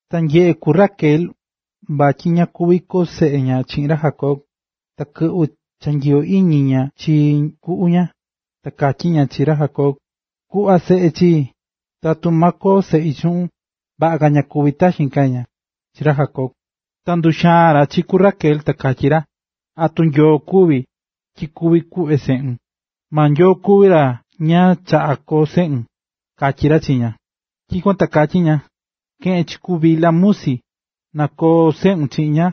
Ta nyeꞌe̱ ku Raquel, vatyi ña kuví koo seꞌe ña chiꞌin ra Jacob, ta kɨꞌvɨ̱ cha nyiyo iñi ña chi kuꞌu ña, ta katyí ña chi ra Jacob: ―Ku̱ꞌva seꞌe chii, tatu ma koo seꞌi chuꞌun, vaꞌa ka na kúvi taxin ―katyí ña chi ra Jacob. Ta nduxaa̱n ra chi ku Raquel ta katyí ra: ―¿Atu Nyoo kuví, tyi kuví kuꞌve seꞌun? Maa Nyoo kuví ra ña chaꞌá koo seꞌun ―katyí ra chi ña. Tyikuan ta katyí ña: ―Ke̱ꞌen chi ku Bilha musi, na koo seꞌun chiꞌin ña,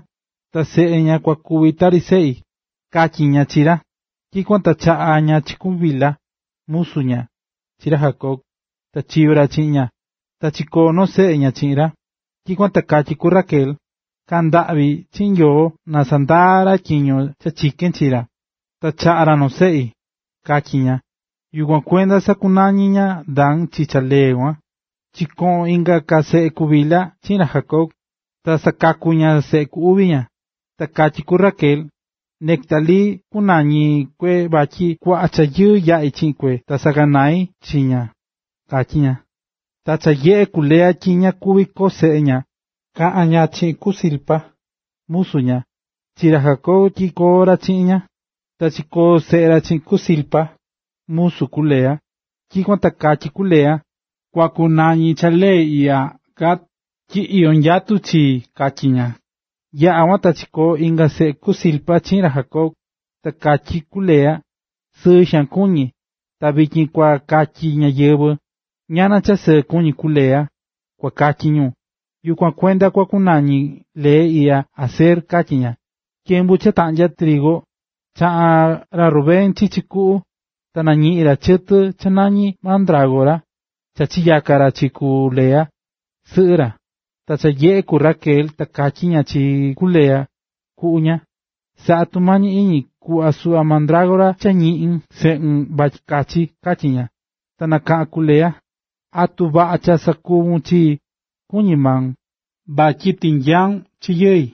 ta seꞌe ña kua kuvi tari seꞌi ―katyí ña chi ra. Tyikuan ta chaꞌa̱ ña chi ku Bilha, musu ña, chi ra Jacob, ta chiyo̱ ra chiꞌin ña. Ta chikoo̱ noo seꞌe ña chiꞌin ra. Tyikuan ta katyí ku Raquel: “Kaꞌa̱n ndaꞌvi chiꞌin Nyoo na sandaa ra tyiño cha chikén chi ra, ta chaꞌa̱ ra noo seꞌi”, katyí ña. Yukuan kuenda sakunañi̱ ña Dan chi cha lee kuan. Chikoꞌo̱n inga chaꞌa seꞌe ku Bilha chiꞌin ra Jacob, ta sakaku̱ ña seꞌe ku uvi. Ta katyí ku Raquel: “Neftalí kunañi kue vatyi kuaꞌa cha yɨɨ yaꞌi̱ chiꞌin kuꞌi ta saꞌaganai̱ chi ña”, katyí ña. Ta cha nyeꞌe̱ ku Lea tyi ña kuví ka koo seꞌe ña, chaꞌa̱ ña chi ku Zilpa, musu ña, chi ra Jacob tyi koo ra chiꞌin ña. Ta chikoo̱ seꞌe ra chiꞌin ku Zilpa, musu ku Lea. Tyikuan ta katyí ku Lea: “Kua kunañi cha lee iꞌya Gad, tyi iyó nyatu chii”, katyí ña. Yaꞌa̱ kuan ta chikoo̱ inga seꞌe ku Zilpa chiꞌin ra Jacob. Ta katyí ku Lea: “Sɨɨ xaan kuñí. Ta vityin kua katyi ñáyɨvɨ: ‘¡Ñana cha sɨɨ kuñí ku Lea!’, kua katyi ñu, yukuan kuenda kua kunañi cha lee iꞌya Aser”, katyí ña. Tyembu cha taꞌnyá trigu, chaꞌa̱n ra Rubén chichi kuꞌu, ta nañiꞌi̱n ra chɨtɨ cha nañí mandrágora, ta chinyaka̱ ra chi ku Lea, sɨꞌɨ ra. Ta cha nyeꞌe̱ ku Raquel, ta katyí ña chi ku Lea, kuꞌu ña: ―Sa̱ꞌa tumañi iñi ku̱ꞌva suꞌva mandrágora cha ñiꞌi̱n seꞌun vatyi kachi ―katyí ña. Ta nakaꞌa̱n ku Lea: ―¿Atu vaꞌa cha sakuvu̱n chii, kuñí maun, vatyi tinyau̱n chi yɨi,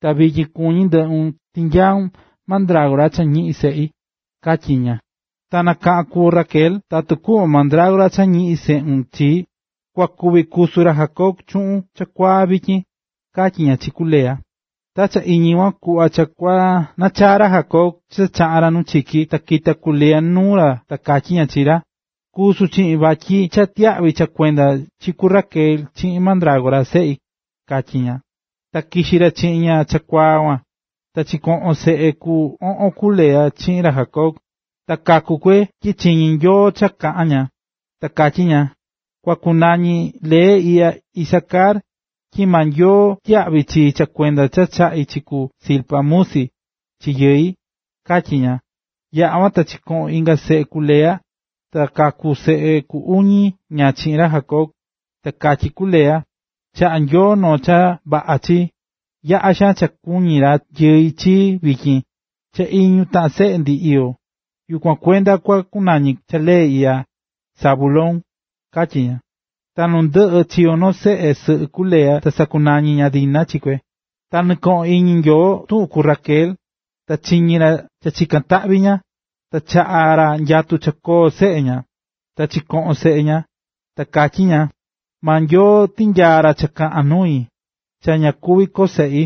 ta vityin kuñí ndɨꞌun tinyaun mandrágora cha ñiꞌi̱n seꞌi? ―katyí ña. Ta nakaꞌa̱n ku Raquel: ―Tatu kuꞌvon mandrágora cha ñiꞌi̱n ra seꞌun chii, kua kuvi kusu ra Jacob chuꞌun chakuaa vityin ―katyí ña chi ku Lea. Ta cha iñi kuan kuꞌva cha kua nachaa ra Jacob cha chaꞌa̱n ra nu chiki, ta kita̱ ku Lea nuu ra ta katyí ña chi ra: ―Kusu chiꞌin vityin vatyi cha tyiyaꞌvi̱ cha kuendon chi ku Raquel chiꞌin mandrágora seꞌi ―katyí ña. Ta kixi ra chiꞌin ña chakuaa kuan. Ta chikoꞌo̱n seꞌe ku oꞌon ku Lea chiꞌin ra Jacob, ta kaku kue tyi chiñi̱ Nyoo cha kaꞌa̱n ña. Ta katyí ña: “Kua kunañi lee iꞌya Isacar, tyi maa Nyoo tyiyaꞌvi̱ chii cha kuenda cha chaꞌi̱ chi ku Zilpa, musi, chi yɨi”, katyí ña. Yaꞌa̱ kuan, chikoꞌo̱n inga seꞌe ku Lea, ta kaku̱ seꞌe ku iñu ña chiꞌin ra Jacob. Ta katyí ku Lea: “Chaꞌa̱ Nyoo noo cha vaꞌa chii, yaꞌa xaan cha kua kuñi yɨi chii vityin, cha iñu taꞌan seꞌe ndi iyó. Yukuan kuenda kua kunañi cha lee iꞌya, Zabulón”, katyí ña. Ta nundɨꞌɨ chiyo̱ noo seꞌe sɨꞌɨ ku Lea ta sakunañi̱ ña Dina chi kue. Ta ñɨkoꞌo̱n iñi Nyoo tuꞌun ku Raquel, ta chiñi̱ ra cha chika̱n taꞌvi ña, ta chaꞌa̱ ra nyatu cha koo seꞌe ña. Ta chikoꞌo̱n seꞌe ña, ta katyí ña: “Maa Nyoo tinyaa̱ ra cha kaꞌan nui, cha ña kuví koo seꞌi.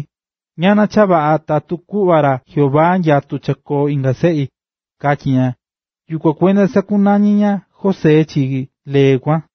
Ñana cha vaꞌa tatu kuꞌva ra Jehová nyatu cha koo inga seꞌi”, katyí ña. Yukuan kuenda sakunañi̱ ña José chi lee kuan.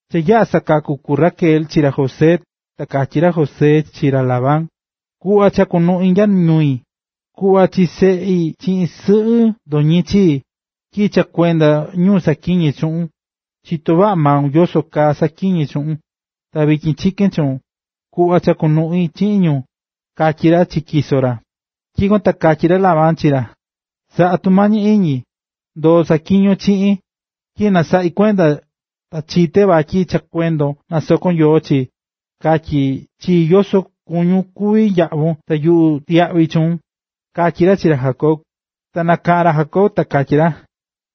Cha yaꞌa̱ sakaku̱ ku Raquel chi ra José, ta katyí ra Jacob chi ra Labán: ―Ku̱ꞌva cha kunuꞌi nya ñui. Ku̱ꞌva chi seꞌi chiꞌin sɨꞌɨ ndotyin chii, tyi cha kuenda ñu saꞌatyiñe̱ chuꞌun, chitó vaꞌa maun yoso kaa saꞌatyiñe̱ chuꞌun. Ta vityin chikén chuun, ku̱ꞌva cha kunuꞌi chiꞌin ñu ―katyí ra chi tyiso ra. Tyikuan ta katyí ra Labán chi ra: ―Sa̱ꞌa tumañi iñi, ndo̱o saꞌatyiñon chiꞌin, tyi cha nasaꞌi̱ kuenda ta chité vatyi cha kuendon nasokó Nyoo chii. Ka̱tyi chii yoso kuñún kuvi yaꞌvun ta yuꞌu tyiyaꞌvi chuun ―katyí ra chi ra Jacob Ta nakaꞌa̱n ra Jacob ta katyí ra: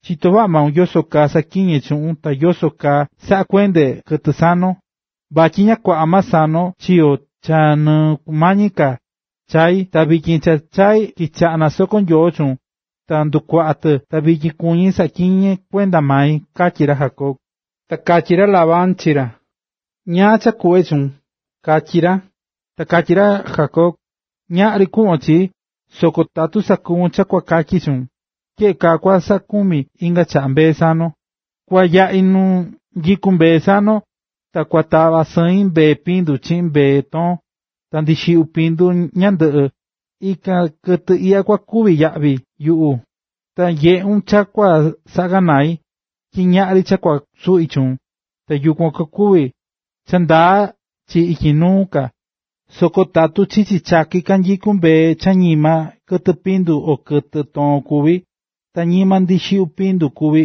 ―Chitó vaꞌa maun yoso kaa saꞌatyiñé chuꞌun ta yoso kaa saꞌakuendé kɨtɨ sanon. Vatyi ña kuaꞌa maa sanon chiyo̱ cha nɨkumañi ka chai̱, ta kɨvɨ cha chai̱ kichaꞌa̱ nasokó Nyoo chuun ta ndukuaꞌa̱ tɨ. Ta vityin kuñí saꞌatyiñé kuenda mai ―katyí ra Jacob. Ta katyí ra Labán chi ra: ―¿Ñáá cha kuꞌve chuun? ―katyí ra. Ta katyí ra Jacob: ―Ñaꞌri kuꞌvon chii, soko tatu sakuvun cha kua katyi chuun. Tyeꞌe kaa kua saꞌakumi inga chaꞌa mbee sanon. Kua yaꞌi nu nyikú mbee sanon, ta kua tava sɨin mbee pindu, chiꞌin mbee toon, ta ndixiꞌyu pindu ñandɨꞌɨ. Ikan kɨtɨ iꞌya kua kuvi yaꞌvi yuꞌu. Ta kua nyeꞌun cha kua saꞌaganai, tyi ñaꞌri cha kua suꞌi chuun, ta yukuan kua kuvi cha ndaa chii ityi nuu ka. Soko tatu chichi chaki kanyikú mbee cha ñima kɨtɨ pindu o kɨtɨ toon kuví, ta ñima ndixiꞌyu pindu kuví,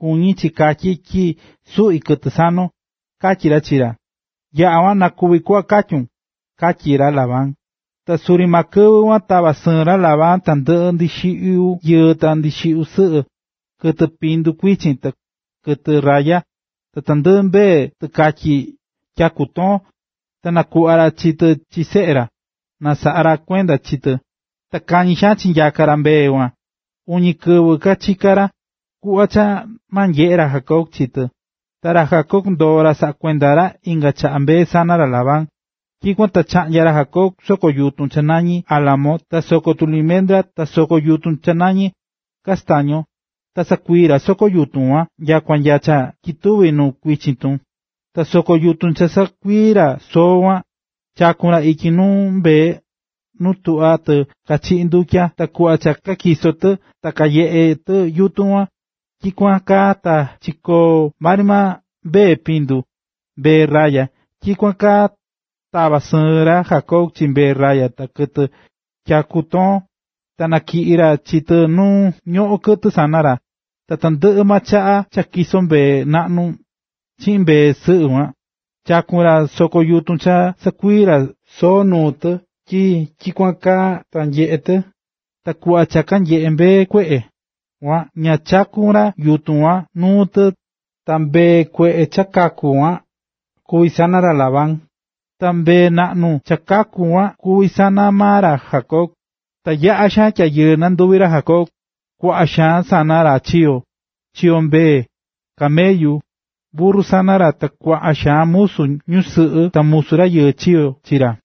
kuñí chi katyi tyi suꞌí kɨtɨ sanon ―katyí ra chi ra. ―Vaꞌa, na kuvi kuꞌva katyún ―katyí ra Labán. Ta suri maa kɨvɨ kuan tava̱ sɨɨn ra Labán tandɨꞌɨ ndixiꞌyu yɨɨ ta ndixiꞌyu sɨꞌɨ, kɨtɨ pindu kuichin, kɨtɨ raya, ta tandɨꞌɨ mbee tɨkatyi tyaku toon, ta nakuꞌva̱ ra chi tɨ chi seꞌe ra, na kasaꞌa kuenda ra chi tɨ. Ta kañi xaan chinyaka̱ ra mbee kuan, uñi kɨvɨ kachika̱ ra, kuꞌva cha ma nyeꞌe ra Jacob chi tɨ. Ta ra Jacob ndoo̱ ra saꞌá kuenda ra inga ka mbee sana ra Labán. Tyikuan ta chaꞌnya̱ ra Jacob soko yutun cha nañí álamo ta soko tulimendra ta soko yutun cha nañí castaño, ta sakuii̱ ra soo soko yutun kuan nyakua nya cha ketuvi̱ nu kuichin tun. Ta soko yutun cha sakuii̱ ra soo kuan, chaku̱n ra ityi nuu mbee nu tuꞌvá tɨ kachiꞌí tɨ ndutya. Ta kuꞌva cha katyisó tɨ ta kanyeꞌé tɨ yutun kuan. Tyikuan kaa ta chikoó maa ri mbee pindu, mbee raya. Tyikuan kaa tava̱ sɨɨn ra Jacob chi mbee raya ta kɨtɨ tyaku toon, ta natyiꞌi̱ ra chi tɨ nu ñoꞌón kɨtɨ sana ra. Ta tandɨꞌɨ chaꞌa cha tyisó mbee naꞌnu chiꞌin mbee sɨꞌɨ kuan, chakún ra soko yutun cha sakuii̱ ra soo nuu tɨ tyi tyikuan kaa ta nyeꞌe tɨ. Ta kuꞌva cha chaá mbee kueꞌe, ña chaku̱n ra yutun kuan nuu tɨ, ta mbee kueꞌe cha kakú kuan kuví sana ra Labán, ta mbee naꞌnu cha kakú kuan kuví sana maa ra Jacob. Ta yaꞌa̱ xaan tyayɨɨ nanduvi̱ ra Jacob, kuaꞌa xaan sana ra chiyo̱, chiyo̱ mbee, camellu, burru sana ra ta kuaꞌa xaan musu ñusɨꞌɨ ta musu rayɨɨ chiyo̱ chi ra.